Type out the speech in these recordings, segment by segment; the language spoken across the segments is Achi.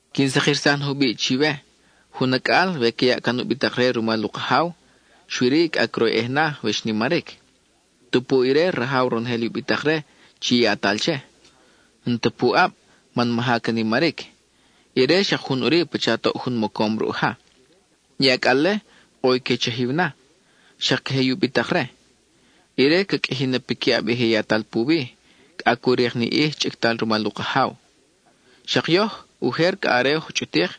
Quin sakirsaj na jubiʼ chiwe: jun acʼal, we ca yaʼ can u bitak-re rumal u kajaw, xui-ri cʼa croyʼej na we xnimaric. Tupu ire rajaw ronojel i u bitak-re chi yatal che, n-ta puʼab man maja ca nimaric; ire xak jun ʼuri pacha toʼ jun mocom ruʼ ja. I acʼal-le, ʼo i que chajiw na, xak queje i u bitak-re. Ire ca qʼuiji na piquiʼab i je yatal puwi, cʼa cu rik ni ʼij chʼictal rumal u kajaw. Xak yoj, ujer cʼa are oj chʼutik,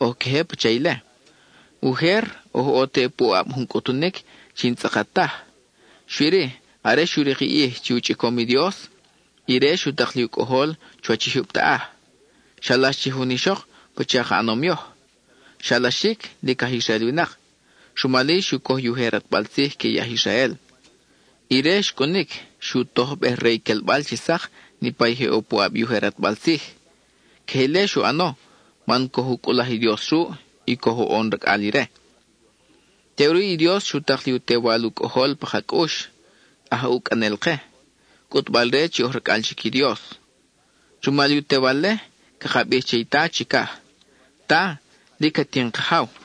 oj queje pacha ile. Ujer oj ʼo te puʼab jun cʼutunic chi n-tzʼakat taj. Xui-ri, are xu rik i ʼij chi u chʼicom i Dios, ire xu tak li u Cʼojol chuwach i jyub taʼaj. Xalax che jun ixok pacha ka ʼanom yoj; xalaxic lic aj Israel winak, rumal-i xu coj i ujer ʼatbal tzij que i aj Israel. Ire xcʼunic xu tojbej re i quelbal chi sak niʼpa je ʼo puʼab i ujer ʼatbal tzij. Queje ile xu ʼano man coj u cʼulaj i Dios ruʼ y coj u ʼon racʼal ire. Teʼuri i Dios xu tak li u Tewal u Cʼojol pa ka cʼux, aj ucʼanel-ke, cʼutbal-re chi oj racʼal chic i Dios. Rumal i u Tewal-le, caka bij che i Ta chicaj: “¡Ta, lic at in Kajaw!”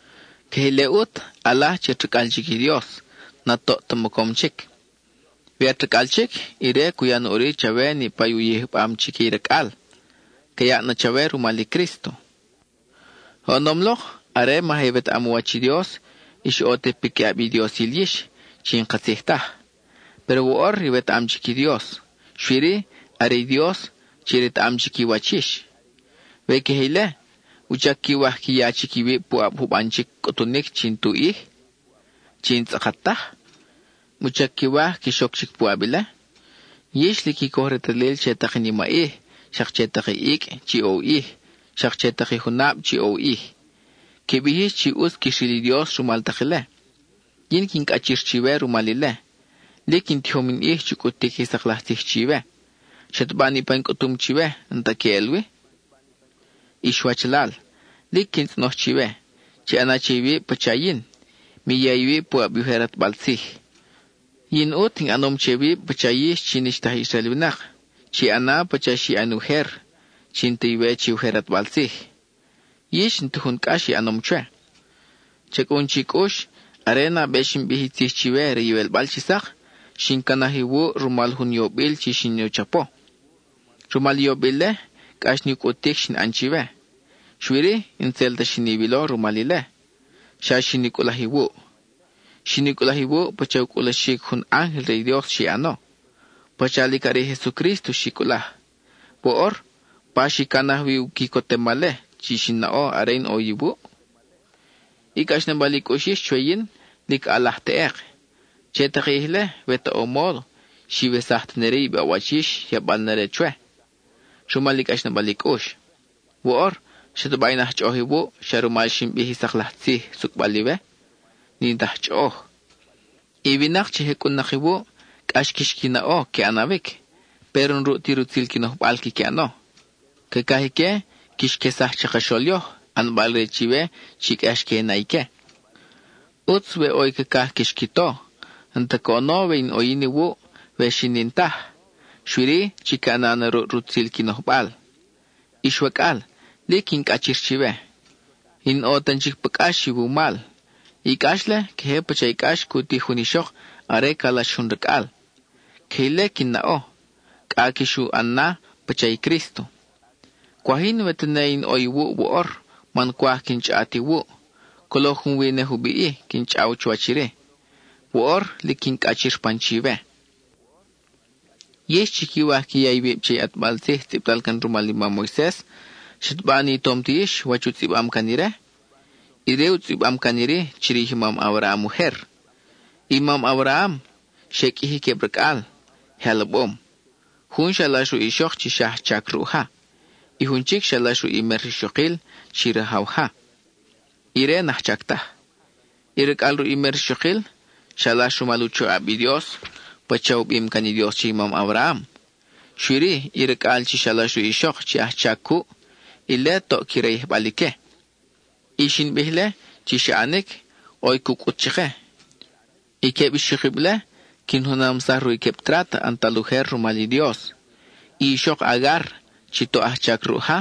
Queje ile ʼut, ʼalaj chi at racʼal chic i Dios, n-at toʼ ta mocom chic. We at racʼal chic, ire cu ya na ʼuri chawe niʼpa i u yijbam chique i racʼal; ca yaʼ na chawe rumal i Crísto. Oʼonom lok, are maja iwetaʼam u wach i Dios, ix ʼo te piquiʼab i diosil yix chi n-katzij taj. Péro woʼor iwetaʼam chic i Dios; xui-ri, are i Dios chi retaʼam chic i wach yix. We queje ile, ¿wuchac quiwaj qui ya chic iwib puʼab juban chic cʼutunic chi n-tu ʼij, chi n-tzʼakat taj? ¿Wuchac quiwaj quix oc chic puʼab ile? Yix lic qui coj retalil che tak i nimaʼij, xak che tak i icʼ chi ʼo u ʼij, xak che tak i junab chi ʼo u ʼij. (Qui bij yix chi ʼutz quix ril i Dios rumal tak ile.) Yin quin cʼachir chiwe rumal ile. Lic in tijom in ʼij chu cʼutic i sak laj tzij chiwe; ¿xataba niʼpa in cʼutum chiwe n-ta queʼel wi? Ix wachalal, lic quin tzʼonoj chiwe, chi ʼana che iwib pacha yin, mi ya iwib puʼab i ujer ʼatbal tzij. Yin ʼut in ʼanom che wib pacha yix chi n-ix ta aj Israel winak. (Chi ʼana pacha xi ʼan ujer, chi n-ta iwe che i ujer ʼatbal tzij.) Yix, n-ta jun cʼax i ʼanom chwe. Cha cʼun chi cʼux, are nabe xin bij i tzij chiwe re i iwelbal chi sak, xin canaj iwuʼ rumal jun yobil chi xin u chapo. Rumal i yobil-le, cʼax ni u cʼutic xin ʼan chiwe. Xui-ri, n-tzel ta xin iwilo rumal ile, xa xin i cʼulaj iwuʼ. Xin i cʼulaj iwuʼ pacha u cʼulaxic jun ángel re i Dios xi ʼano, pacha lic are i Jesucrísto xi cʼulaj. Woʼor, ¿pa xi canaj wi i quicotemal-le chi xi naʼo are in ʼo wi iwuʼ? I cʼaxnabal i cʼux yix chwe yin lic ʼalaj teʼek. Che tak i ʼij-le, we ta ʼo módo, xiwesaj tene-ri i baʼwach yix yabal na-re chwe, rumal i cʼaxnabal i cʼux. Woʼor ¿xataba in aj chʼoʼoj iwuʼ, xa rumal xin bij i sak laj tzij sucʼbal iwe? N-in ta aj chʼoʼoj. I winak chi je cʼun-nak iwuʼ, cʼax quix qui naʼo que ʼanawic; péro n-ruʼ ti rutzil qui nojbal quiqui ʼano. Cacaj ique quix quesaj chakaxol yoj, ʼanbal-re chiwe chi cʼax que i na ique. ʼUtz we ʼo i cacaj quix qui to, n-ta coʼono we in ʼo yin iwuʼ, we xi n-in taj, xui-ri, chiqui ʼana na ruʼ rutzil qui nojbal. Ix wacʼal, lic quin cʼachir chiwe; in ʼo tan chic pa cʼax iwumal. I cʼax-le queje pacha i cʼax cu tij jun ixok are calax jun racʼal. Queje ile quin naʼo cʼa quix u ʼan na pacha i Crísto. Cwaj yin we tene in ʼo iwuʼ woʼor man cwaj quin chʼaʼat iwuʼ; colo junwi ne jubiʼ-i quin chʼaw chuwach iri. Woʼor, lic quin cʼachir pan chiwe. Yix chi quiwaj qui ya iwib che i ʼatbal tzij tzʼibtal can rumal i mam Moises, ¿xataba ni tom ti yix wach u tzʼibam can ire? Ire u tzʼibam can iri chirij i mam Abraham ujer: i mam Abraham, xe qʼuiji queb racʼal, je alabom. Jun xalax ruʼ ixok chi xa ajchac ruʼ ja: i jun chic xalax ruʼ i mer rixokil chi rajaw ja, ire n-ajchac taj. I racʼal ruʼ i mer rixokil, xalax rumal u choʼab i Dios pacha u bim can i Dios che i mam Abraham; xui-ri i racʼal chi xalax ruʼ i ixok chi ajchac cuʼ, ile toʼ qui rayijbal ique. I xin bij-le chi xa ʼanic, ʼo i cu cʼut chake. I queb ixokib-le quin junamsaj ruʼ i queb trat ʼantal ujer rumal i Dios. I ixok Agar, chi toʼ ajchac ruʼ ja,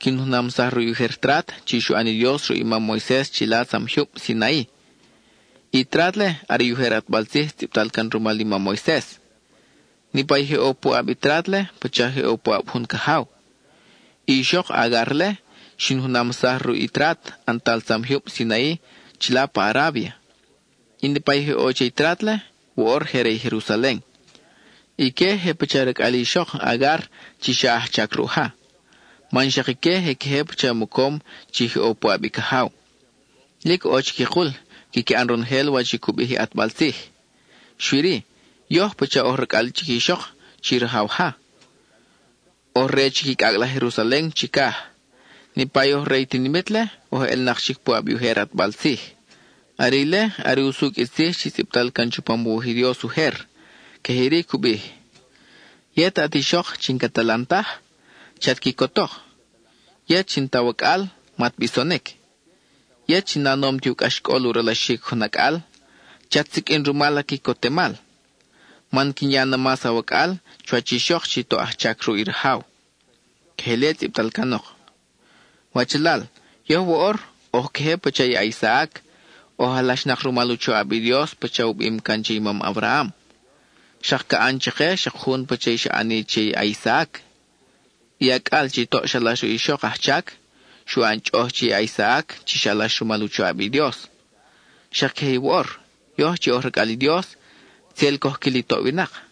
quin junamsaj ruʼ i ujer trat chi xu ʼan i Dios ruʼ i mam Moises chila tzam jyub Sinai. I trat-le are i ujer ʼatbal tzij tzʼibtal can rumal i mam Moises. Niʼpa i je ʼo puʼab i trat-le pacha je ʼo puʼab jun cajaw. I ixok Agar-le xin junamsaj ruʼ i trat ʼantal tzam jyub Sinai chila pa Arábia, y niʼpa i je ʼo che i trat-le, woʼor je re i Jerusalen. Ique je pacha i racʼal i ixok Agar chi xa ajchac ruʼ ja, man xak ique je queje pacha mocom chi je ʼo puʼab i cajaw. Lic ʼo chiquikul quiqui ʼan ronojel wach i cu bij i ʼatbal tzij. Xui-ri, yoj pacha oj racʼal chic i ixok chi rajaw ja; oj re chic i cʼacʼ laj Jerusalen chicaj. Niʼpa oj re i tinimit-le oj elnak chic puʼab i ujer ʼatbal tzij. Are ile are usucʼ i tzij chi tzʼibtal can chupam u wuj i Dios ujer. Queje iri cu bij: Yet at ixok chi n-cat alan taj, chat quicotok; yet chi n-ta awacʼal, mat bisonic. Yet chi na nom ti u cʼaxcʼol u ralaxic jun acʼal, chat siqʼuin na rumal a quicotemal. Man quin ya na mas awacʼal chuwach i ixok chi toʼ ajchac ruʼ i rajaw. (Queje ile tzʼibtal canok.) Wachalal, yoj woʼor oj queje pacha i a-Isaac; oj alaxnak rumal u choʼab i Dios pacha u bim can che i mam Abraham. Xak ca ʼan chake xak jun pacha i xa ʼani che i a-Isaac; i acʼal chi toʼ xalax ruʼ i ixok ajchac, xu ʼan chʼoʼoj che i a-Isaac chi xalax rumal u choʼab i Dios. Xak queje i woʼor; yoj chi oj racʼal i Dios, tzel coj quil i toʼ winak.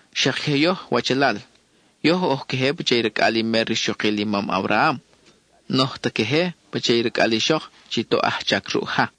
Xak queje yoj wachalal, yoj oj queje pacha i racʼal i mer rixokil i mam Abraham; n-oj ta queje pacha i racʼal i ixok chi toʼ ajchac ruʼ ja.